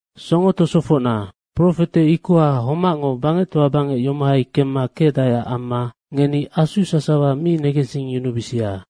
Songo tosofocna, profete ikoha homacngo bangectoa bangec yomohai kemma kecdaeac amma ngeni asu sasawa mi negensingyunubisia.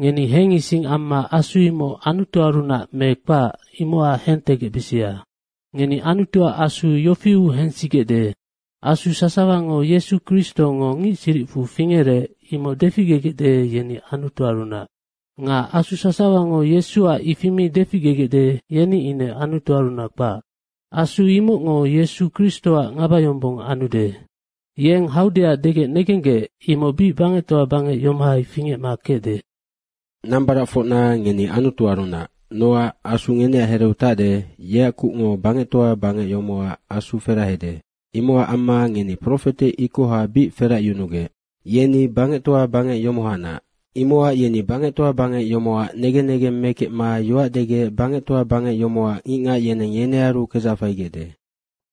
Ngeni hengising amma asu imoc Anutuarunac me kpac, imocac hentegecbisia. Ngeni Anutuac Asu yofiu hensigecde, Asu sasawango Yesu Kristongo ngic siricfu fingerec, imoc deficgegecde, yeni Anutuarunac. Nga asu sasawango Yesuac ifi mi deficgegecde, yeni ine Anutuarunac kpac. Asu imocngo Yesu Kristoac ngabayombong anude. Yeng haudeac degec negenggec, imoc bic bangectoa bangec yomohai fingecma kecde. Nambaracfocna, ngeni Anutuarunac. Nocac Asu ngeneac hereu tacde, yeac kucngo bangectoa bangec yomocac asu ferahede, imocac amma ngeni profete ikoha bic feracyunugec. Yeni bangectoa bangec yomohanac. Imocac yeni bangectoa bangec yomocac negen negeng mekecma yoac degec bangectoa bangec yomocac ngicngac yeneng yenearu kedzac faigecde.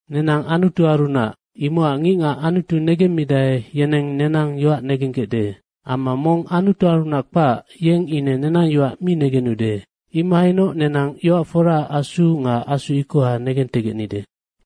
Nenang Anutuarunac, imocac ngicngac Anutu negemmidae, yeneng nenang yoac negenggecde. Amma mong Anutuarunac kpac, yeng ine nenang yoac mi negenude. Imohainoc nenang yoac foraac Asu nga asu ikoha hentegecnide.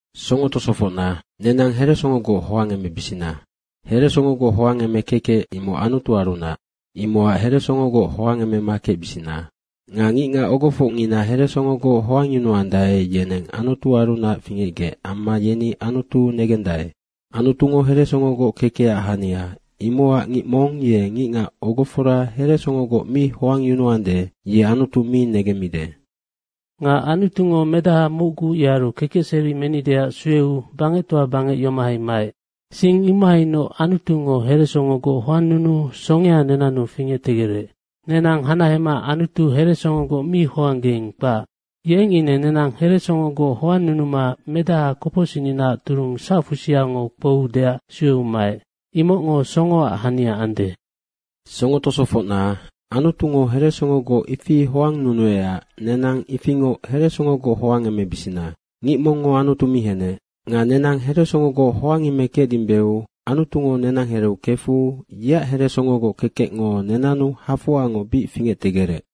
Songo tosofocna, nenang heresongogoc hoangemebisina. Heresongogoc hoangeme kekec, imoc Anutuarunac, imocac heresongogoc hoangemema kecbisina. Nga ngicngac ogofocngina heresongogoc hoangyunuandae, yeneng Anutuarunac fingecgec amma yeni Anutu negendae. Anutungo heresongogoc kekecac hania, imocac ngic mong ye ngicngac ogofora heresongogoc mi hoangyunuande, ye Anutu mi negende. Nga Anutungo Medaha mocgu, yearu kekecseri menideac sueu bangectoa bangec yomohai maec. Sing imahainoc Anutungo heresongogoc hoannunuu songea nenannu fingectegerec. Nenang hanahema Anutu heresongogoc mi hoanggeing, kpac. Yeng ine nenang heresongogoc hoannunuma Medaha kopocsicninaac turung sacfusiango kpouudeac sueu maec. Imocngo songoac hania ande. Songo tosofocna, Anutungo heresongogoc ifi hoannunuecac nenang ifingoc heresongogoc hoangemebisina. Ngic mongngo Anutu mi henec. Nga nenang heresongogoc hoangemekecdimbeu Anutungo nenang hereu kefu yeac heresongogoc kekecngo nenannu hafoangoc bic fingectegerec.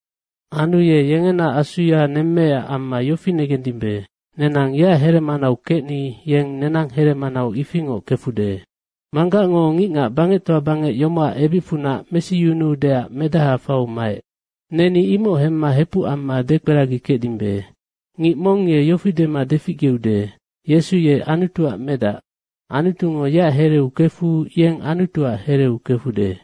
Anu ye yengena Asuya nemmeecac amma yofi negendimbe, nenang yeac heremanau kecni yeng nenang heremanau ifingoc kefude. Manggacngo ngicngac bangectoa bangec yomocac ebicfunac mesiyunuudeac Medaha faiu maec. Neni imoc hemma hepuc amma dekperagikecdimbe. Ngic mong ye yofi dema deficgeude, “Yesu ye Anutuac Medac” Anutungo yeac hereu kefu yeng Anutuac hereu kefude.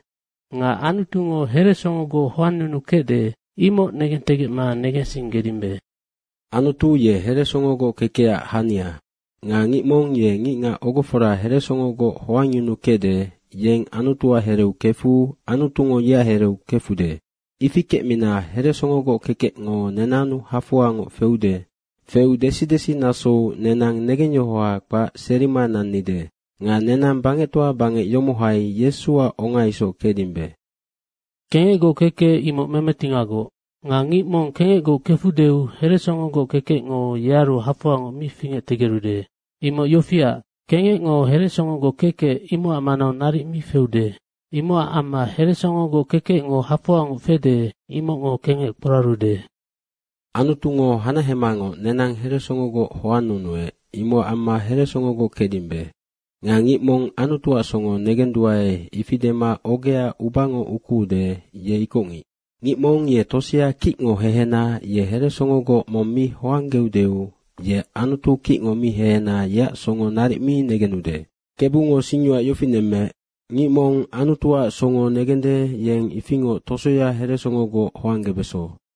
Nga Anutungo heresongogoc hoannunukecde, imoc negentegecma negensinggedimbe. Anutu ye heresongogoc kekecac hania nga ngic mong ye ngicngac ogofora heresongogoc hoangyunukecde, yeng Anutuac hereu kefu Anutungo yeac hereu kefude. Ifi kecmina heresongogoc kekecngo nenannu hafoangoc feude. Feu desidesi nasou nenang negengyohoha kpac serima nannide. Nga nenang bangectoa bangec yomohai Yesuac onga isoc kecdimbe. Kengecgoc kekec, imoc memetingagoc. Nga ngic mong kengecgoc kefudeu heresongogoc kekecngo yearu hafoangoc mi fingectegerude. Imoc yofiac, kengecngo heresongogoc kekec, imocac manau naric mi feude. Imocac amma heresongogoc kekecngo hafoangoc fede, imocngo kengec kporarude. Anutungo hanahemangoc nenang heresongogoc hoannunuec, imocac amma heresongogoc kecdimbe. Nga ngic mong Anutuac songo negenduae, ifi dema ogea ubango ukuude, ye ikocngic. Ngic mong ye tosea kicngo hehena, ye heresongogoc mong mi hoanggeudeu ye Anutu kicngo mi hehena, yeac songo naric mi negenude. Kebungo singyoac yofi nemmeec, ngic mong Anutuac songo negende, yeng ifingoc tosoya heresongogoc hoanggebeso.